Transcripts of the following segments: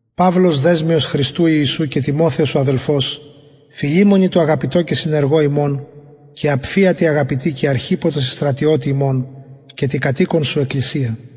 παυλος δεσμιος χριστου ιησου και τιμοθεος ο αδελφος φιλημονι τω αγαπητω και συνεργω ημων και απφια τη αγαπητη και αρχιππω τω συστρατιωτη ημων και τη κατ οικον σου εκκλησια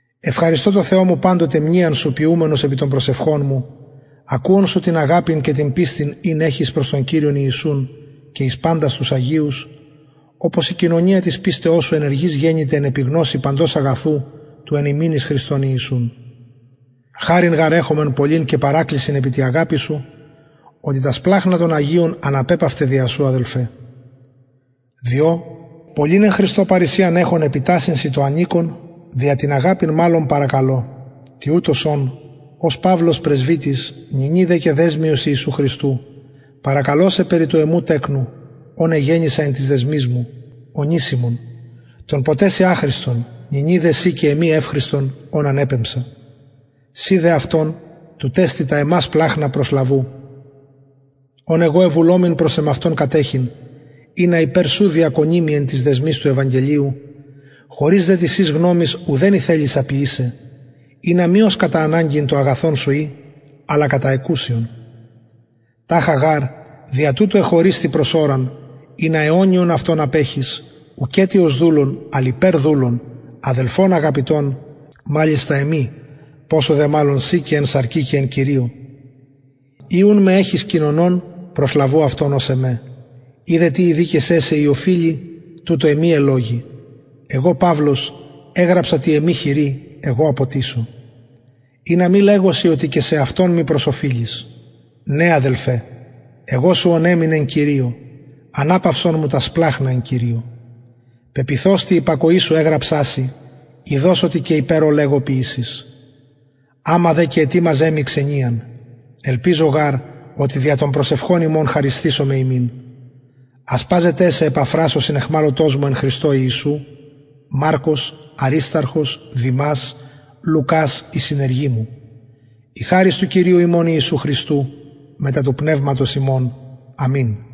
ευχαριστω τω θεω μου παντοτε μνειαν σου ποιουμενος επι των προσευχων μου ακουων σου την αγαπην και την πιστιν ην εχεις προς τον κυριον ιησουν και εις παντας τους αγιους οπως η κοινωνια της πιστεως σου ενεργης γενηται εν επιγνωσει παντος αγαθου του εν ημιν εις χριστον ιησουν χαριν γαρ εχομεν πολλην και παρακλησιν επι τη αγαπη σου οτι τα σπλαγχνα των αγιων αναπεπαυται δια σου αδελφε διο πολλην εν χριστω παρρησιαν εχων επιτασσειν σοι το ανηκον δια την αγαπην μαλλον παρακαλω τοιουτος ων ως παυλος πρεσβυτης νυνι δε και δεσμιος ιησου χριστου παρακαλω σε περι του εμου τεκνου ον εγεννησα εν τοις δεσμοις μου ονησιμον τον ποτε σοι αχρηστον νυνι δε σοι και εμοι ευχρηστον ον ανεπεμψα συ δε αυτον τουτ εστιν τα εμα σπλαγχνα προσλαβου ον εγω εβουλομην προς εμαυτον κατεχειν ινα υπερ σου διακονη μοι εν τοις δεσμοις του ευαγγελιου χωρις δε της σης γνωμης ουδεν ηθελησα ποιησαι ινα μη ως κατα αναγκην το αγαθον σου η αλλα κατα εκουσιον ταχα γαρ δια τουτο εχωρισθη προς ωραν ινα αιωνιον αυτον απεχης ουκετι ως δουλον αλλ υπερ δουλον αδελφον αγαπητον μαλιστα εμοι ποσω δε μαλλον σοι και εν σαρκι και εν κυριω ει ουν με εχεις κοινωνον προσλαβου αυτον ως εμε ει δε τι ηδικησεν σε η οφειλει τουτο εμοι ελλογει εγω παυλος εγραψα τη εμη χειρι εγω αποτισω ινα μη λεγω σοι οτι και σεαυτον μοι προσοφειλεις ναι αδελφε εγω σου οναιμην εν κυριω αναπαυσον μου τα σπλαγχνα εν κυριω πεποιθως τη υπακοη σου εγραψα σοι ειδως οτι και υπερ ο λεγω ποιησεις αμα δε και ετοιμαζε μοι ξενιαν ελπιζω γαρ οτι δια των προσευχων υμων χαρισθησομαι υμιν ασπαζονται σε επαφρας ο συναιχμαλωτος μου εν χριστω ιησου μαρκος αρισταρχος δημας λουκας οι συνεργοι μου η χαρις του κυριου ημων ιησου χριστου μετα του πνευματος υμων αμην